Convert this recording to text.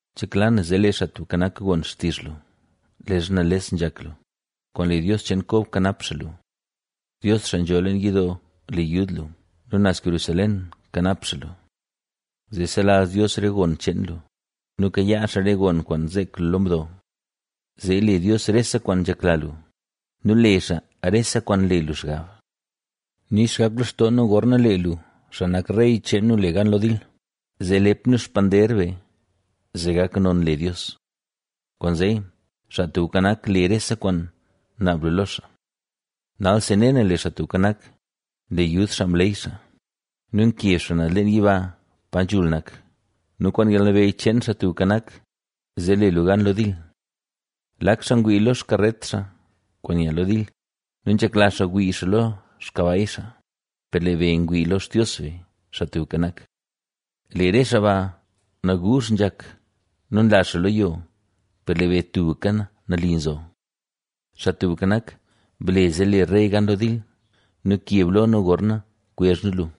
Nzhekla na zee lee Xaa Tubka Nak gon xtizh lu leezha nales nzhak lu; kwaan le Dios cheen Kob kanap xaa lu. Dios xaa nzho leen yidoo le yud lu; nu naz Jerusalén kanap xaa lu. Zee selazh Dios re gon cheen lu nu kayaa xaa re gon kwaan zeek lu lo mdo. Zee le Dios rese kwaan nzhekla lu nu le xaa rese kwaan nle lu xgab. Nix gak lextoo nu gorna lee lu, xaa nak rey cheen nu, le gan lo dil, zee lep nu xpander be zee gak non le Dios. Kwaanzee, Xaa Tubka Nak le rese kwaan naab lu lo xaa. Nalsi ne na, lee Xaa Tubka Nak nle yud xaa mleey xaa nu nkeb xaa naz leen yiba pa nzhul nak nu kwaan yalnabeyy cheen Xaa Tubka Nak, zee le nu gan lo dil. Lak xaa ngwii lo xkaret xaa kwaan nya lo dil nu zlak xaa ngwii lo xkabay xaa; per lee be ngwii lo Xtios be, Xaa Tubka Nak. Lee re xaa ba naguuzh nzhak nu nla xaa lo yo, per lee be tubka nali zo. Xaa Tubka Nak, ¡ble zee le rey gan lo dil! ¡Nu keb lo nu gorna kwezh nu lu!